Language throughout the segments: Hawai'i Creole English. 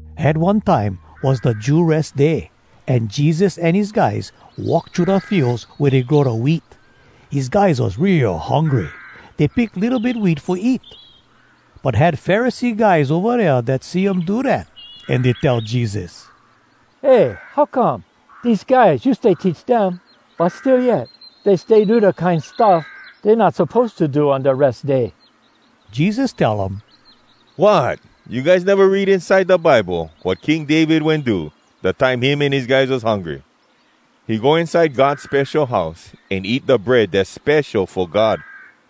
Had one time was da Jew Res Day, an Jesus an his guys walk thru da fields wea dey grow da wheat. His guys was real hungry. Dey pick litto bit wheat fo eat. But had Pharisee guys ova dea dat see um do dat, an dey tell Jesus, “Eh, how come! Dese guys, you stay teach dem, but still yet dey stay do da kine stuff dey not suppose to do on da Res Day!” Jesus tell um, “Wot! You guys neva read inside da Bible wat King David wen do, da time him an his guys was hungry? He go inside God spesho house, an eat da bread dass spesho fo God.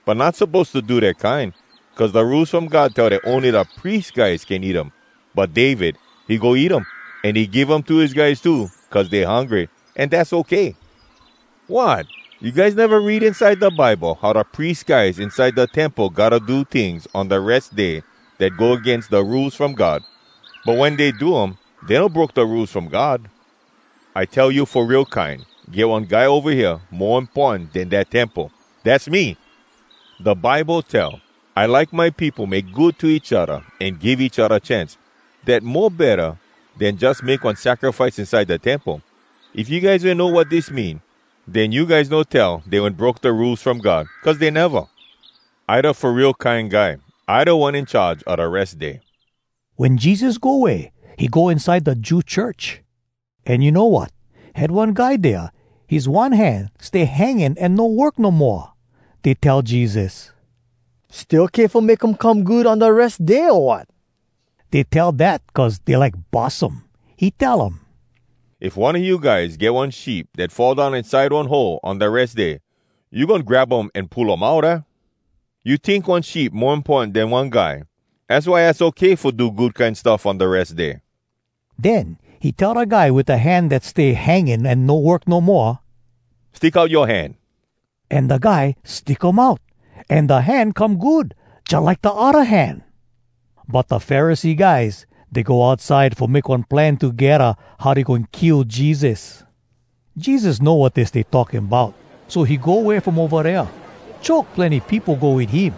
But not suppose to do dat kine, cuz da Rules From God tell dat ony da pries guys can eat um. But David, he go eat um, an he give um to his guys too cuz dey hungry, an dass okay. Wot! You guys neva read inside da Bible how da pries guys inside da temple gotta do tings on da Res Day dat go agains da Rules From God? But wen dey do um, dey no broke da Rules From God. I tell you fo real kine, get one guy ova hea mo importan den dat temple. Dass me! Da Bible tell, ‘I like my peopo make good to each odda an give each odda chance. Dat mo betta den jus make one sacrifice inside da temple.’ If you guys wen know wat dis mean, den you guys no tell dey wen broke da Rules From God, cuz dey neva. I da Fo Real Kine Guy. I da one in charge a da Res Day.” Wen Jesus go way, he go inside da Jew church. An you know wat? Had one guy dea, his one hand stay hanging an no work no moa. Dey tell Jesus, “Stay okay fo make um come good on da Res Day, o wat?” Dey tell dat cuz dey like bus um. He tell um, “If one a you guys get one sheep dat fall down inside one hole on da Res Day, you goin grab um an pull um out, aah? You tink one sheep mo importan den one guy? Az why az okay fo do good kine stuff on da Res Day.” Den he tell da guy wit da hand dat stay hanging an no work no moa, “Stick out yoa hand.” An da guy stick um out, an da hand come good, jalike da odda hand. But da Pharisee guys, dey go outside fo make one plan togedda how dey goin kill Jesus. Jesus know wat dey stay talking bout, so he go way from ova dea. Choke plenny peopo go wit him,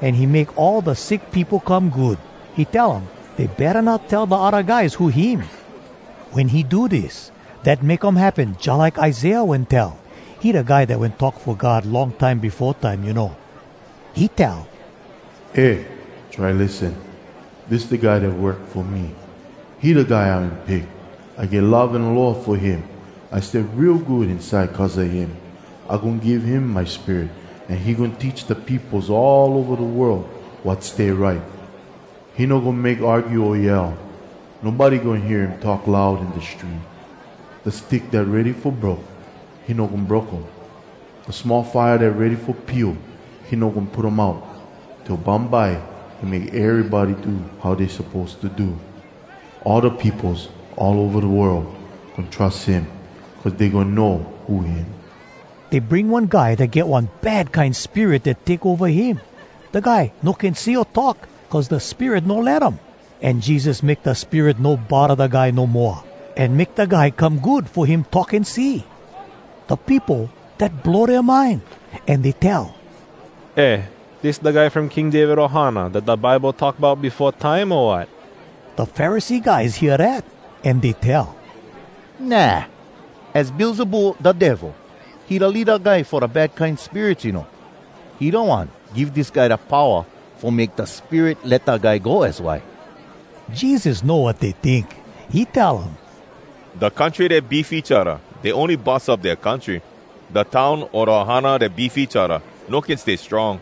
an he make all da sick peopo come good. He tell um dey betta not tell da odda guys who him. Wen he do dis, dat make um happen jalike Isaiah wen tell. (He da guy dat wen talk fo God long time befo time, you know.) He tell: “Eh, try lissen! Dis da guy dat work fo me. He da guy I wen pick. I get love an aloha fo him, I stay real good inside cuz a him. I goin give him my Spirit, An he goin teach da peopos all ova da world wat stay right. He no goin make argue o yell. Nobody goin hear him talk loud in da street. Da stick dat ready fo broke, he no goin broke um, Da small fire dat ready fo pio, he no goin put um out, Till bumbye he make erybody do how dey suppose to do. All da peopos all ova da world goin trus him, Cuz dey goin know who him.” Dey bring one guy dat get one bad kine spirit dat take ova him. Da guy no can see o talk, cuz da spirit no let um. An Jesus make da spirit no bodda da guy no moa, an make da guy come good fo him talk an see. Da peopo, dat blow dea mind, an dey tell, “Eh, dis da guy from King David ohana dat da Bible talk bout befo time, o wat?” Da Pharisee guys hear dat, an dey tell, “Nah! Az Beelzebul, da Devil. He da leada guy fo da bad kine spirits, you know. He da one give dis guy da powa fo make da spirit let da guy go, az why!” Jesus know wat dey tink. He tell um, “Da country dat beef each odda, dey ony bus up dea country. Da town o da ohana dat beef each odda, no can stay strong.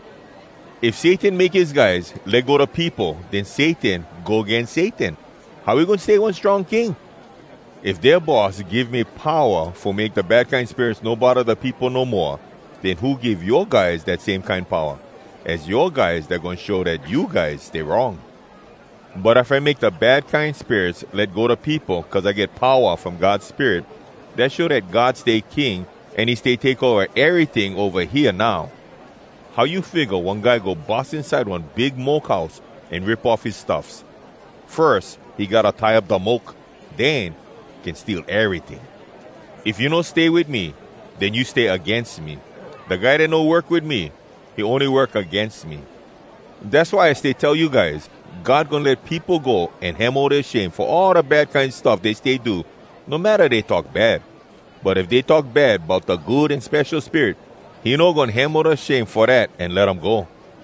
If Satan make his guys let go da peopo, den Satan go agains Satan! How he goin stay one strong king?! If dea boss give me powa fo make da bad kine spirits no bodda da peopo no moa, den who give yoa guys dat same kine powa? Az yoa guys dat goin show dat you guys stay wrong! But if I make da bad kine spirits let go da peopo cuz I get powa from God Spirit, dat show dat God stay king, an he stay take ova eryting ova hea now. “How you figga one guy go bus inside one big moke house an rip off his stuffs? Firs, he gotta tie up da moke! Den can steal eryting. If you no stay wit me, den you stay agains me. Da guy dat no work wit me, he ony work agains me. Dass why I stay tell you guys, God goin let peopo go an hemo dea shame fo all da kine bad stuff dey stay do, no matta dey talk bad. But if dey talk bad bout da Good An Spesho Spirit, he no goin hemo da shame fo dat an let um go.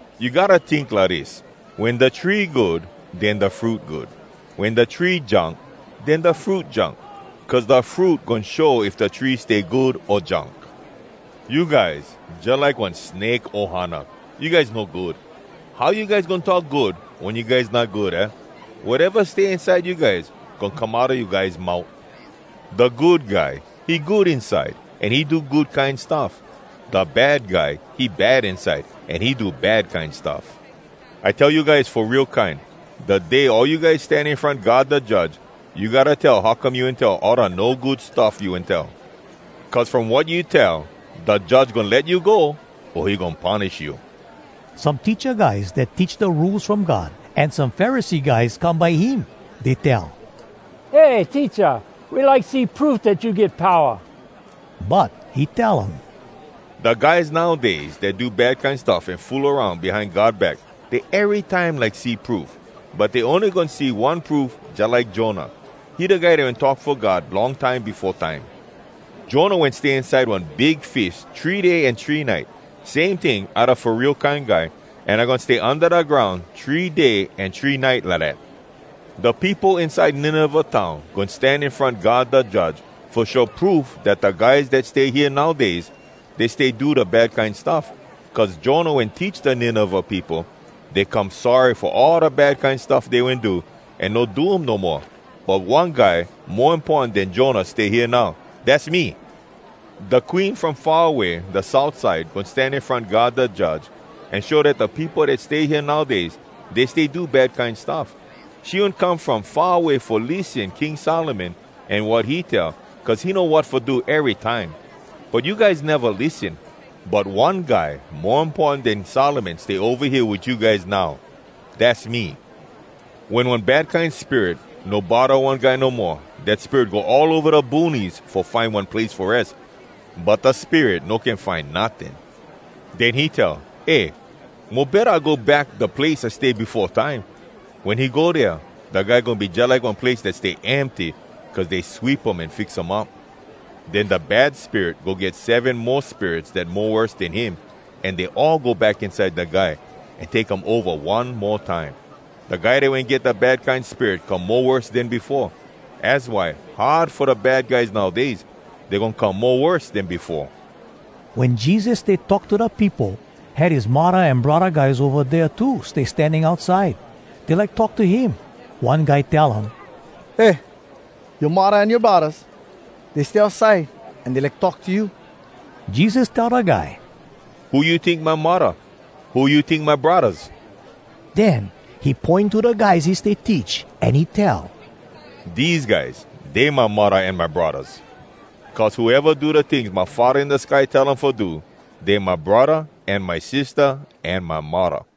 “You gotta tink lidis: Wen da tree good, den da fruit good. Wen da tree junk, den da fruit junk. Cuz da fruit goin show if da tree stay good o junk. You guys jalike one snake ohana! You guys no good. How you guys goin talk good wen you guys not good, aah? Wateva stay inside you guys, goin come outa you guys mout. Da good guy, he good inside, an he do good kine stuff. Da bad guy, he bad inside, an he do bad kine stuff. I tell you guys fo real kine, da day all you guys stan in front God da Judge, you gotta tell how come you wen tell all da no good stuff you wen tell. Cuz from wat you tell, da Judge goin let you go, o he goin punish you.” Some teacha guys dat teach da Rules From God, an some Pharisee guys come by him. Dey tell, “Eh, Teacha, we like see proof dat you get powa!” But he tell um, “Da guys nowdays dat do bad kine stuff an fool aroun behind God back, dey erytime like see proof, but dey ony goin see one proof jalike Jonah. He da guy dat wen talk fo God long time befo time. Jonah wen stay inside one big fish three day an three nite. Same ting, I Da Fo Real Kine Guy, an I goin stay unda da groun three day an three nite lidat. “Da peopo inside Nineveh town goin stan in front God da Judge fo show proof dat da guys dat stay hea nowdays, dey stay do da bad kine stuff. Cuz Jonah wen teach da Nineveh peopo, dey come sorry fo all da bad kine stuff dey wen do, an no do um no moa. But one guy mo importan den Jonah stay hea now. Dass me. “Da queen from far away da south side goin stan in front God da Judge an show dat da peopo dat stay hea nowdays, dey stay do bad kine stuff. She wen come from far away fo lissen King Solomon an wat he tell cuz he know wat fo do erytime. But you guys neva lissen. But one guy mo importan den Solomon stay ova hea wit you guys now. Dass me. “Wen one bad kine spirit no bodda one guy no moa, dat spirit go all ova da boonies fo find one place fo res, but da spirit no can find notting. Den he tell, ‘Eh, mo betta I go back da place I stay befo time.’ Wen he go dea, da guy goin be jalike one place dat stay empty cuz dey sweep um an fix um up. Den da bad spirit go get seven mo spirits dat mo worse den him, an dey all go back inside da guy, an take um ova one mo time. Da guy dat wen get da bad kine spirit come mo worse den befoa. Az why hard fo da bad guys nowdays. Dey goin come mo worse den befoa.” Wen Jesus stay talk to da peopo, had his muddah an braddah guys ova dea too stay standing outside. Dey like talk to him. One guy tell um, “Eh, yoa muddah an yoa braddahs, dey stay outside, an dey like talk to you.” Jesus tell da guy, “Who you tink my muddah? Who you tink my braddahs?” Den he poin to da guys he stay teach, an he tell, “Dese guys, dey my muddah an my braddahs. Cuz whoeva do da tings my Faddah in da sky tell um fo do, dey my braddah an my sistah an my muddah.”